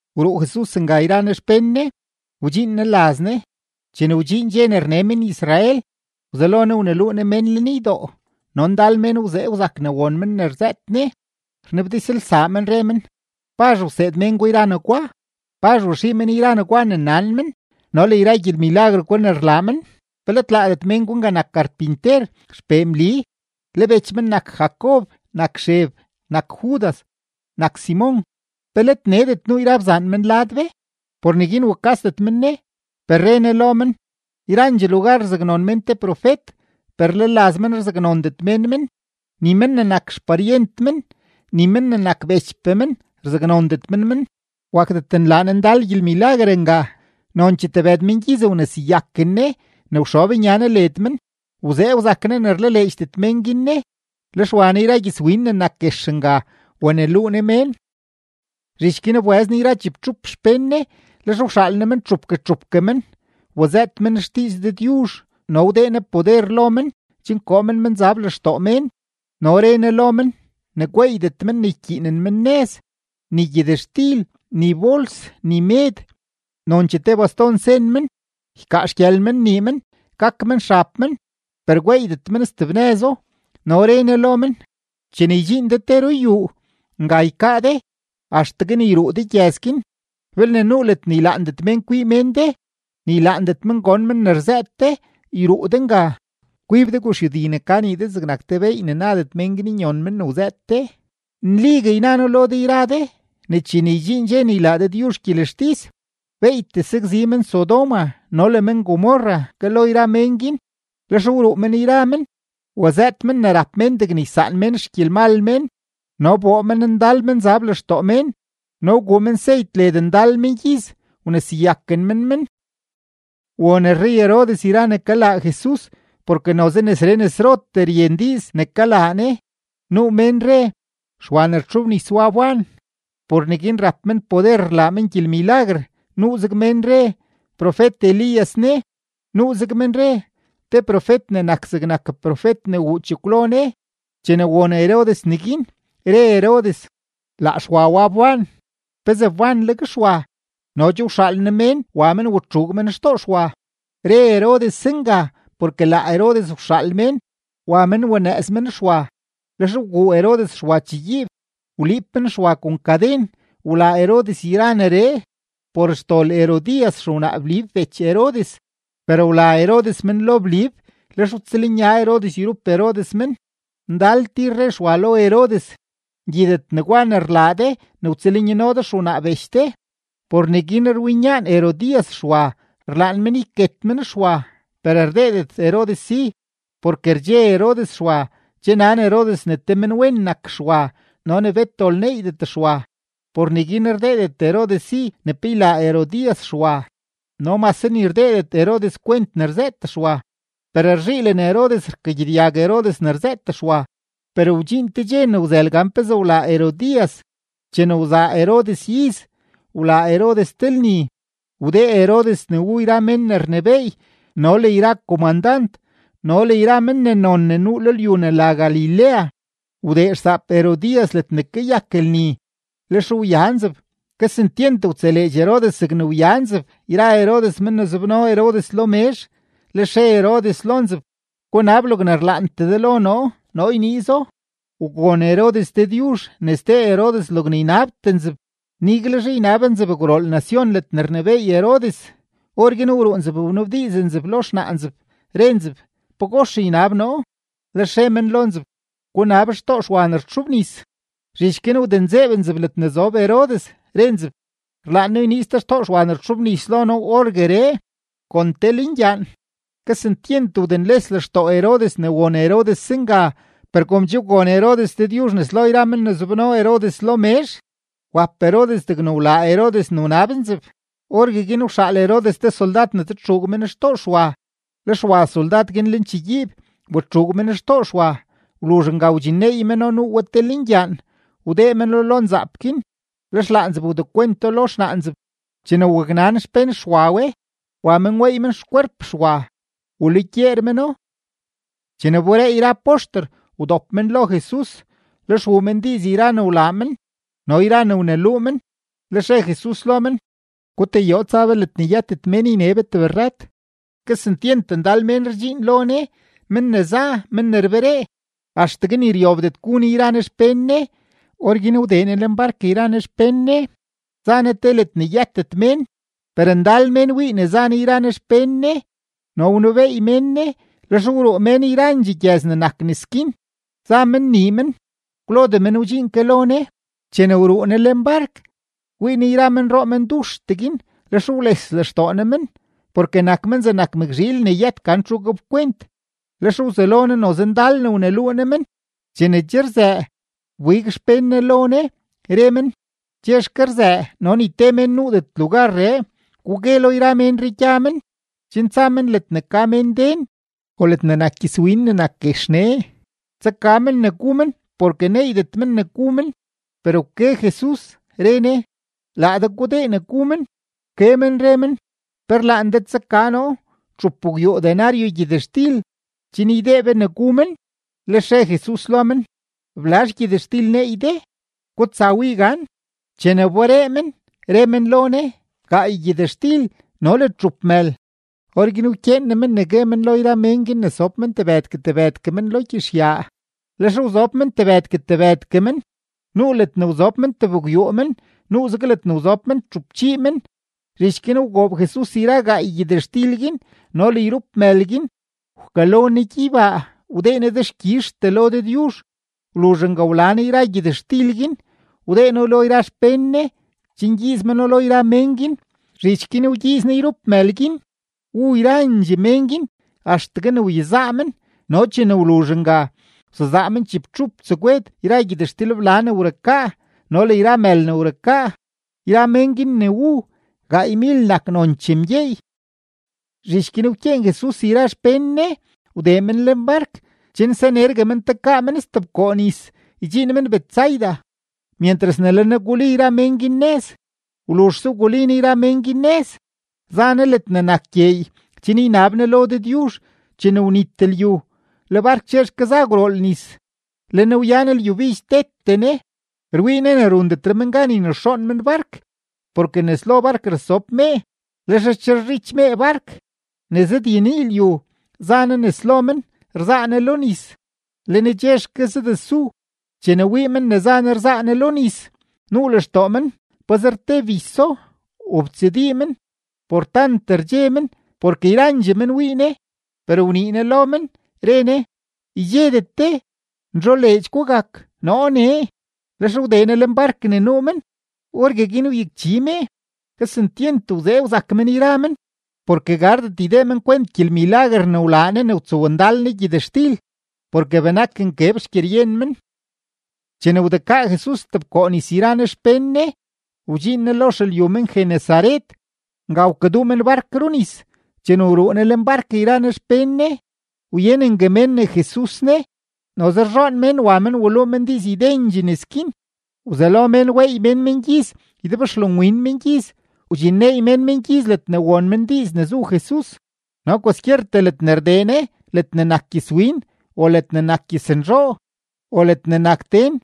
Wruu Jesus nga yra Ne xpén Ne, wdxiin Ne laz Ne. Chene wdxiin dxe ne rne men-Israel, wzelo Ne wneluu Ne mén lenydoo; no ndal mén wzee wzak ne won men ne rzëët Ne, rnabdizlsaa men, re men: ―¿Pazh wseed mén gwa yra negwa? ¿Pazh waxii men yra negwa ne nan men no le yra gyelmilaguer gwa ne rlaa men? ¿Pe let laadet men gwa nga nak karpinter, xpee Mli, le bech men nak Jacob, nak Xeb, nak Judas, nak Simon? ¿Pe let needet nuu yra bzaan men lad be? Por neguin wukasdet men Ne. Per re Ne lo men: ―Yrandxee lugar rzaknon mén te profet, per le laz men rzaknondet mén men, ni men ne nak xparyent men, ni men ne nak bechpee men rzaknondet men men. Wakdet nlaa Ne ndal gyelmilaguer nga, nonchee tebëd mengyiz wneseyaken Ne ne wxob nya Ne led men. Wzee wzak Ne ne rlaleedxdet mén guin Ne. Lex wa Ne yra gyëzwin ne nak guex nga, waneluu Ne mén. Zhich guin wbëz Jesus yra chibtxup xpén Ne, lex wxaal Ne men txupgue txupgue men, wazëët men xdiiz Dëdyuzh no wdee Ne poder lo men chen koo men menzab lextoo mén. No re Ne lo men ne gweeydet men ne ykyiinen men nëz, ni gyëtxtil, ni bols, ni med, nonchee te baston sen men. Ykaa xgyël men nii men, gak men xab men, per gweeydet men steb nëzo. No re Ne lo men: ―Chene ydxiin de te ruyuu, nga ykaa de axtegue ne yruu de gyëz guin. Belne nuu ledne ylaandet mén kwii men de ni ylaandet men gon men ne rzëët de, yruu de nga, kwib de guxyudi ne ka nii de zegnak te beey ne nadet mén guin nyon men ne wzëët de. Nligue yna noo lo de yra de ne chene ydxiin dxe ne ylaa Dëdyuzh gyelextis, beeytee sakzi men-Sodoma no le men-Gomorra ke lo yra mén guin. Lex wruu men yra men, wazëët men ne rap mén degne ysaan mén xgyelmal mén. No wboo men ndal menzab lextoo mén, no wguu men seyt led ndal mengyiz, wneseyaken men men. Won rrey-Herodes yra ne kalaa Jesus, porke noze nesree nesrotee ryen diiz ne kalaa Ne. Nuu mén re: ―Xwa ne rtxobnis wa wban. Por neguin rap men poder rlaa men gyelmilaguer. Nuuzeg mén re: ―Profet-Elías ne. Nuuzeg men re: ―Te profet ne nak zegnak profet ne wuu chekwlo ne. Chene won Herodes neguin, re Herodes: ―Laa Xwa wa wban. ¿Pezee wbanleg Xwa? No che wxaal noo mén wa men watxuug men xtoo Xwa. Re Herodes zenga porke laa Herodes wxaal mén, wa men wanëëz men Xwa, lex wguu Herodes Xwa chegyiib, wliib men Xwa kon kaden. Wlaa Herodes yra neree por xdol Herodías xewnaa Blib bech Herodes, per wla Herodes men lo Blib, lex wtsëlnya Herodes yrup Herodes men. Ndal tir re Xwa lo Herodes: ―Ngyidet negwa ne rlaa de ne wtsëlnyano de xewnaa bech de. Por neguin rwinyaan Herodías Xwa, rlaan men yket men Xwa, per rdeedet Herodes si, porke rdxe Herodes Xwa, che nan Herodes ne te menwen nak Xwa no ne bet dol neeydet Xwa. Por neguin rdeedet Herodes si ne pe ylaa Herodías Xwa; no mase ni rdeedet Herodes kwent ne rzëët Xwa, per rzhiilen Herodes rkagyedyag Herodes ne rzëët Xwa. Per wdxiin te dxe ne wzël gan pezee wlaa Herodías. Chene wzaa Herodes iz, wlaa Herodes te lni. Wdee Herodes ne wu yra men ne rnebééy no le yra komandant no le yra men ne non ne nuu lo lyu ne la Galilea. Wdee xsaap Herodías ledne kayak lni, lex wya nzeb. Kesentyent wtseleedx Herodes zegne wya nzeb yra Herodes men ne zobno Herodes lo mezh; lex re Herodes lo nzeb: ―Gunab logne rlaantee de lo noo, noo yniizo. Wgon Herodes Dëdyuzh ne sdee Herodes logne ynabtee nzeb, niguelzhe ynab nzeb gwrool nacion ledne rnebééy Herodes. Orguin wruu nzeb wanabdiiz nzeb lo xnaa nzeb, re nzeb: ―¿Pagox ynab noo? Lex re men lo nzeb: ―Gunab xtoo Xwa ne rtxobnis. Zhich guin wdenzeeb nzeb ledne zob Herodes, re nzeb: ―Rlaan noo yniiz de xtoo Xwa ne rtxobnis lo noo orgueree kon te lengyaan. Kesentyent wdenles lextoo Herodes ne won Herodes zenga; per kom che wgon Herodes Dëdyuzh nes lo yra men ne zobno Herodes lo mezh, wap Herodes degne wlaa Herodes ne wnab nzeb. Orgueguin wxaal Herodes te soldad ne tsatxuug men xtoo Xwa. Lex wa soldad guin lenchegyiib, watxuug men xtoo Xwa. Wluzh nga wdxinneey meno nuu we te lengyaan, wdee meno lo nzaap guin, lex laa nzeb wdekwento lo xnaa nzeb. Chene waknan xpén Xwa we, wa men weey men xkwerp Xwa, walugyeer meno. Chene wberee yra poxter, wdop men lo Jesus, lex wuu men diiz yra ne wlaa men no yra ne wneluu men. Lex re Jesus lo men: ―Gutayoo tsa be ledne yëtet mén yne be tebrrat. Kesentyent ndal mén rdxiin lo Ne, men ne za, men ne rberee, axtegue ni ryobdet gu Ne yra Ne xpén Ne. Orguin wdee Ne lenbark yra Ne xpén Ne, za Ne te ledne yëtet mén. Per ndal mén wii ne za Ne yra Ne xpén Ne no wnebeey men Ne. Lex wruu mén yrandxee gyëz ne nak nes guin, za men nii men, kwlodee men wdxiin ke lo Ne. Chene wruu Ne lenbark, wii Ne yra menroo menduxtee guin; lex wles lextoo Ne men, porke nak men zegnak mëkzhiil ne yët gan txu gapkwent. Lex wzelo Ne noze ndal ne wneluu Ne men. Chene che rzëë, wbig xpén Ne lo Ne, re men: ―Chexke rzëë no ni te mén nuudet lugarree. Gugue lo yra ménree gya men, chen tsa men ledne ka mén den o ledne nak gyëzwin ne nak guex nee, tsaka men ne gu men porke neeydet men ne gu men. Per wke Jesus, re Ne: ―Laa de gudee ne gu men. Wke men re men: ―¿Pe rlaan de tsaka noo txupgwyuu denario gyëtxtil chen ydee be ne gu men? Lex re Jesus lo men: ―¿Blazh gyëtxtil neey de? Gutsa wii gan. Chene wberee men, re men lo Ne: ―Gaay gyëtxtil no le txup mël. Orguin wkyeen Ne men ne gue men lo yra mén guin ne sob men tebëdgue tebëdgue men lo gyizhyaa. Lex wzob men tebëdgue tebëdgue men, nuu ledne wzob men tebgwyuu men, nuuzeg ledne wzob men txupchii men. Zhich guin wgoob Jesus yra gaay gyëtxtil guin no le yrup mël guin, wkalo Ne gyeybaa, wdee Ne dexkyizhtee lo Dëdyuzh. Wluzh nga wla Ne yra gyëtxtil guin, wdee No lo yra xpén Ne chen ygyiiz meno lo yra mén guin. Zhich guin wgyiiz Ne yrup mël guin. Wu yrandxee mén guin axtegue ne wyezaa men, no chene wluzh nga, wsezaa men chibtxup tsegwed yra gyëtxtilbla ne wrukaa no le yra mël ne wrukaa. Yra mén guin ne wu, gaaymil nak nonchee mgyeey. Zhich guin wkyeen Jesus yra xpén Ne wdee men lenbark chen sanergue men tekaa men stebkoo nis, ydxiin men Betsaida, myentras ne le Ne guli yra mén guin nëz. Wluzhse wguli Ne yra mén guin nëz, za Ne ledne nak gyeey chen ynab Ne lo Dëdyuzh. Chene wnit lyu, le bark chexke za gwrool nis, le Ne wyan lyubidx tete Ne. Rwii Ne ne rundetre men gan ynexoon men bark, porke nes lo bark rasob mee, lex rcherezhich mee bark. Ne zëdyenii lyu, za Ne nes lo men rzaa Ne lo nis, le Ne chexke zadesu. Chene wii men ne za Ne rzaa Ne lo nis, nuu lextoo men pazer te biso, wobtsadii men por tant rdxe men, porke yrandxee men wii Ne. Per wnii Ne lo men, re Ne: ―¡Ydxedet de, nzholeedx gugak, noo nee! Lex wdee Ne lenbark ne nuu men, orgueguin wyakchi mee. Kesentyent wzee wzak men yra men, porke gardet ydee men kwent gyelmilaguer ne wlaa Ne ne wtsowndal Ne gyëtxtil, porke benak nkeb xgyeryen men. Chene wdekaa Jesus stebkoo nis yra Ne xpén Ne, wdxiin Ne lo xelyu men-Genesaret. Nga wkaduu men bark runis. Chene wruu Ne lenbark yra Ne xpén Ne, wyenengue mén ne Jesus ne. Noze rzhoon mén wa men waluu men diiz ydendxee nes guin. Wzelo mén weey men mengyiz ydebxlonwin mengyiz, wdxinneey men mengyiz ledne won men diiz ne zu Jesus. No kwaskyertee ledne rdee Ne ledne nak gyëzwin o ledne nak gyëznzhoo o ledne nak den,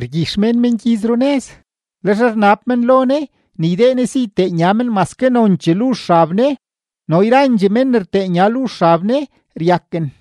rgyix mén mengyiz runëz, lex rnab men lo Ne ne ydee Ne si ytee nya men maske nonchee luzh xab Ne, no yrandxee mén ne rtee nya luzh xab Ne ryaken.